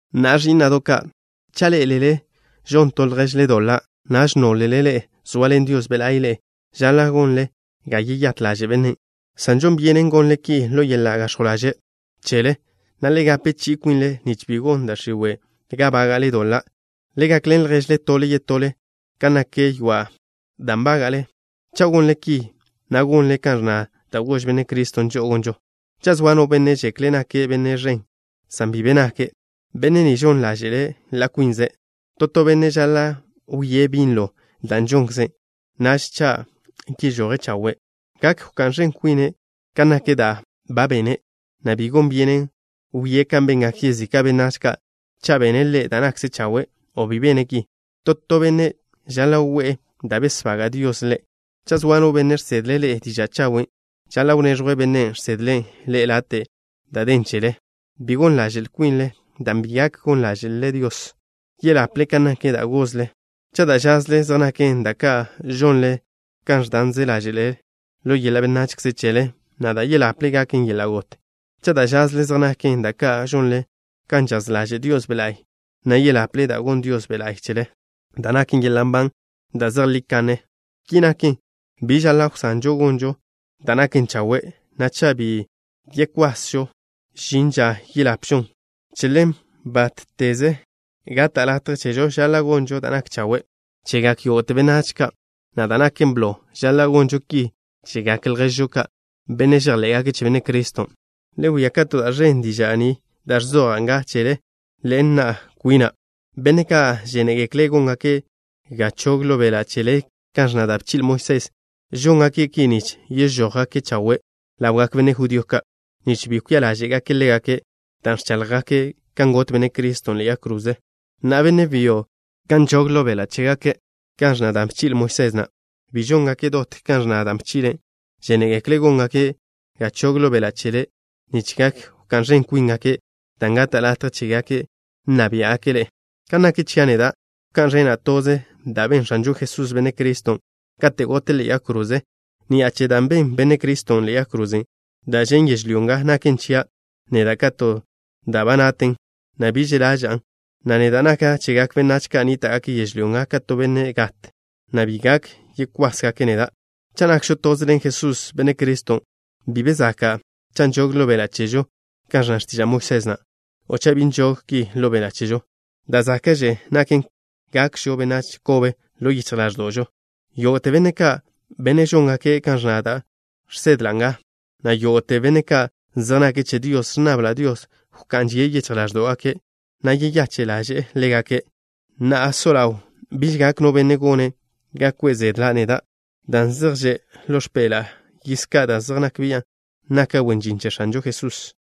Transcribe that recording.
Na'a, ẕí'na'do' ka', cha' ḻé'elele žon to lježle doḻa', naž nólele ḻe'e zoaḻen Dios Be' La'y ḻe'e, žaḻa' gonle ga yeyát ḻaže' bennen', san žon byenen gonle ki ḻo yeḻa' gax̱jw ḻaže' chele, na' le gape chi'i kwinle nich bi gon da' x̱iwe' ga bága'le doḻa'. Le gakḻen lježle tole yetole kan nak ywa' da' nbága'le. Cha' gonle ki, na' gonle kan ẕnna da' gož Benne' Criston' žo'o gonžo. Cha' zoa no benne' žekle' nake' benne' ẕen, san bi be nake', benne' ni žon ḻáže'le' ḻa' kwinze'. To to benne' žaḻa' wie' binlo da' žonkze'. Naž cha' yežoje' chawe', gak wká'n ẕen kwine' kan nak da' ba bene', na' bi gon byenen wie' kan bengak yezika' benách ka' cha' bene' ḻe' da' nakže chawe' o bi bene' ki. To to benne' žaḻa' we'e da' besbaga' Dios ḻe'. Cha' zoa no benne' žsedle' ḻe'e diža' chawen', žaḻa' wnéẕjwle bennen' žsedle' ḻe'e late' da' den chele. Bi gon ḻaže'l kwinle, dan' bi gak gon ḻáže'lele Dios. Yeḻaple kan nak da' gozle. Cha' da' žazle zej naken da' ka' žonle kan ẕdanze ḻáže'le ḻo yeḻa' benachze chele, na' da' yeḻaple gaken yeḻa' got. Cha' da' žazle zej naken da' ka' žonle kan žaz ḻaže' Dios Be' La'y, na' yeḻaple da' gonn Dios Be' La'y chele, da' naken yeḻa' nban da' zejlí kanne. Ki naken, bi žaḻa' wsanžo gonžo da' naken chawe', na' cha' bi yekwasžo, žin ža yeḻapžon. Che ḻen, bátteze gata' latje chežo, žaḻa' gonžo da' nak chawe' chegak yógo'te benách ka', na' da' naken blo, žaḻa' gonžo ki chegak lježžo ka', benne' žejḻé'gake' che Benne' Criston'. Le wia kato da' ẕen diža' ni da' ẕzoja' nga chele ḻen na' kwina'. Benne' ka' žénegekle' góngake' ga chog ḻo beḻa' chele kan ẕnna da' bchi'le Moisés na', žóngake' ki nich yežójgake' chawe' ḻawgak benne' judío ka', nich bi kwia ḻáže'gake' ḻégake' dan' ẕcháḻjgake' kan got Benne' Criston' ḻe'e yag kroze. Na'a, benne' byo ka' nžog ḻo beḻa' chégake' kan ẕnna da' bchi'le Moisés na', bi žóngake' dot kan ẕnna da' bchi'le'. Žénegekle' góngake' ga chog ḻo beḻa' chele nich gak wká'n ẕen kwíngake' dan' gata' latje chégake' nna biá'gake' ḻe'e. Kan nak chia' neda', wká'n ẕena' toze da' ben X̱anžo Jesús, Benne' Criston', katen' gote' ḻe'e yag kroze. Ni'a che da' ben Benne' Criston' ḻe'e yag kroze, da' žen' yežlyó nga naken chia' neda' ka to da' ba naten, na' bi že' ḻaža'an, na' neda' naka' chegak benách ka' nníta'gake' yežlyó nga ka to benne' gat, na' bi gak yekwásgake' neda'. Cha' nakžo toze ḻen Jesús, Benne' Criston', bi be zaka' cha' nžog ḻo beḻa' chežo kan ẕnna x̱tiža' Moisés na', o cha' bi nžog ki ḻo beḻa' chežo. Da' záka'kze naken gakžo benách kobe ḻo yichj ḻáẕdo'žo. Yógo'te benne' ka', benne' žóngake' kan ẕnna da' žsedla' nga, na' yógo'te benne' ka' zej nake' che Dios, ẕnnabla' Dios wká'n žie' yichj ḻáẕdo'gake', na' yeyache' ḻaže'e ḻégake'. Na'a so ḻaw, biž gak no benne' gone' ga kwe' zedla' neda', dan' zej že' ḻo x̱peḻa'a yiž ka' da' zej nak bian' naka' wen žin che X̱anžo Jesusen'.